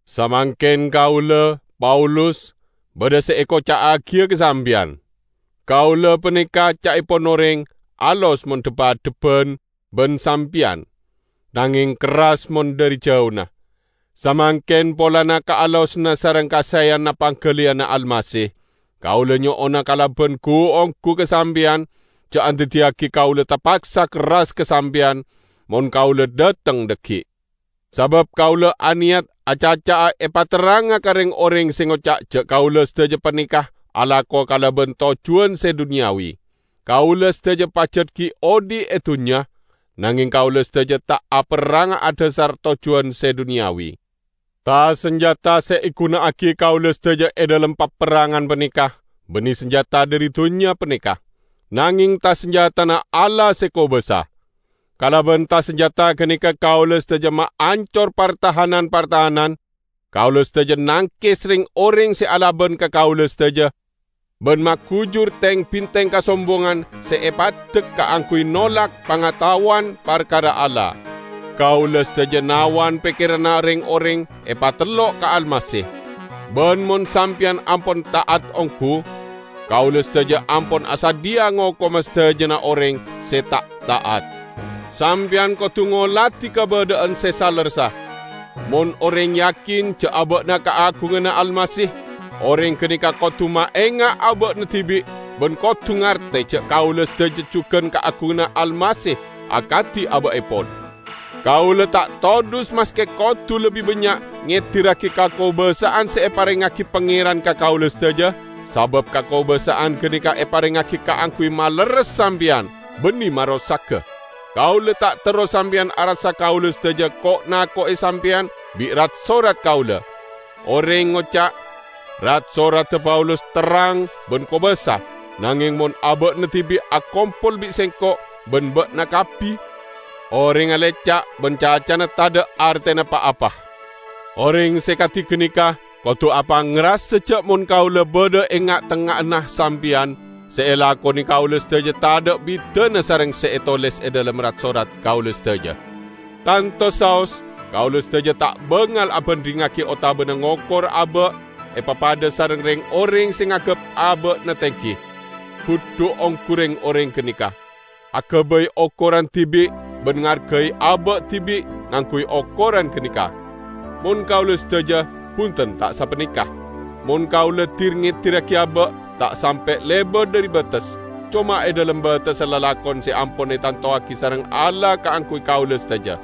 Samangken kaula, Paulus, badha se ekoca'agiya ka sampeyan. Kaula paneka, ca'epon oreng, alos mon dhep-adhebban ban sampeyan, nangeng kerras mon dhari jauna. Samangken, polana kaalosanna sareng kasaeyanna panggaliyanna Almasih, kaula nyo'ona kalaban gu-onggu ka sampeyan, ja' andaddiyagi kaula tapaksa kerras ka sampeyan mon kaula dhateng dhaggi'. Sabab kaula aneyat acaca'a epaterranga ka reng-oreng se ngoca' ja' kaula sadaja paneka alako kalaban tojjuwan se duniyawi. Kaula sadaja pajat gi' odhi' e dunnya, nangeng kaula sadaja ta' aperranga adhasar tojjuwan se duniyawi. Ta-sanjata se eguna'agi kaula sadaja e dhalem paperrangan paneka banne sanjata dhari dunnya paneka, nangeng ta-sanjatana Allah se kobasa. Kalaban ta-sanjata ganeka kaula sadaja maancor partahanan-partahanan; kaula sadaja nangkes reng-oreng se alaban ka kaula sadaja ban magujur teng-binteng kasombongan se epaddek kaangguy nolak pangataowan parkara Allah. Kaula sadaja nawan pekkeranna reng-oreng epatellok ka Almasih. Ban mon sampeyan ampon ta'at onggu, kaula sadaja ampon asadhiya ngokoma sadajana oreng se ta' ta'at. Sampeyan kodu ngoladi kabadha'an se salerressa. Mon oreng yakin ja' aba'na kaagunganna Almasih, oreng ganeka kodu maenga' aba'na dibi' ban kodu ngarte ja' kaula sadaja jugan kaagunganna Almasih akadi aba'epon. Kaula ta' todhus maske kodu lebbi bannya' ngedirragi kakobasa'an se eparengngagi Pangeran ka kaula sadaja, sabab kakobasa'an ganeka eparengngagi kaangguy malerres sampeyan, banne marosaga. Kaula ta' terro sampeyan arassa kaula sadaja ko'-nako'e sampeyan bi' rat-sorat kaula. Oreng ngoca', "Rat-soradda Paulus terrang ban kobasa, nangeng mon aba'na dibi' akompol bi' sengko' ban ba'na kabbi, orengnga leca' ban cacana tadha' artena pa-apa!" Oreng se kadi ganeka kodu apangrasa ja' mon kaula badha e nga'-tengnga'anna sampeyan, se elakone kaula sadaja tadha' bidana sareng se etoles e dhalem rat-sorat kaula sadaja. Tanto saos kaula sadaja ta' bangal abandhingngagi otabana ngokor aba' epapadha sareng reng-oreng se nganggep aba'na tenggi. Budhu onggu reng-oreng ganeka! Agabay okoran dibi' ban ngargai aba' dibi' ngangguy okoran ganeka. Mon kaula sadaja, bunten ta' sapaneka. Mon kaula dir-ngedirragi aba', ta' sampe' lebat dhari bates, coma e dhalem batessa lalakon se ampon etantowagi sareng Allah kaangguy kaula sadaja.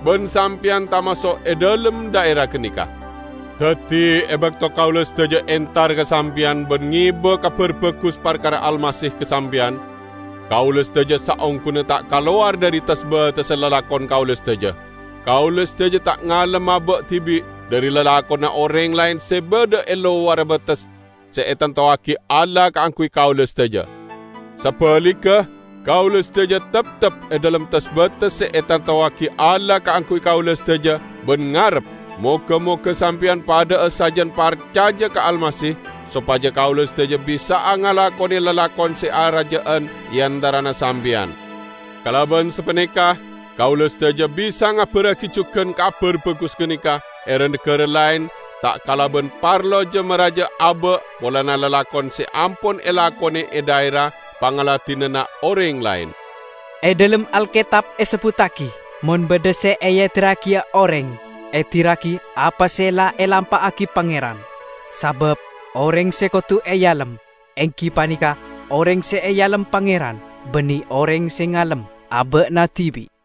Ban sampeyan tamaso' e dhalem dhaera ganeka. Daddi, e bakto kaula sadaja entar ka sampeyan ban ngeba Kabar Bagus parkara Almasih ka sampeyan, kaula sadaja saongguna ta' kalowar dhari tes-batessa lalakon kaula sadaja. Kaula sadaja ta' ngalem aba' dibi' dhari lalakonna oreng laen se badha e lowarra bates se etantowagi Allah kaangguy kaula sadaja. Sabaligga, kaula sadaja teptep e dhalem tes-bates se etantowagi Allah kaangguy kaula sadaja ban ngarep moga-moga sampeyan padha'a sajan parcaja ka Almasih, sopaja kaula sadaja bisa'a ngalakone lalakon se araja'an e antarana sampeyan. Kalaban sapaneka kaula sadaja bisa ngabarragi jugan Kabar Bagus ganeka e ra-nagara laen ta' kalaban parlo ja-maraja aba' polana lalakon se ampon elakone e dhaera pangladinanna oreng laen. E dhalem Alketab esebbuttagi, "Mon badha se eedirragiya oreng, edirragi apa se la elampa'agi Pangeran." Sabab oreng se kodu ealem enggi paneka oreng se ealem Pangeran, banne oreng se ngalem aba'na dibi'.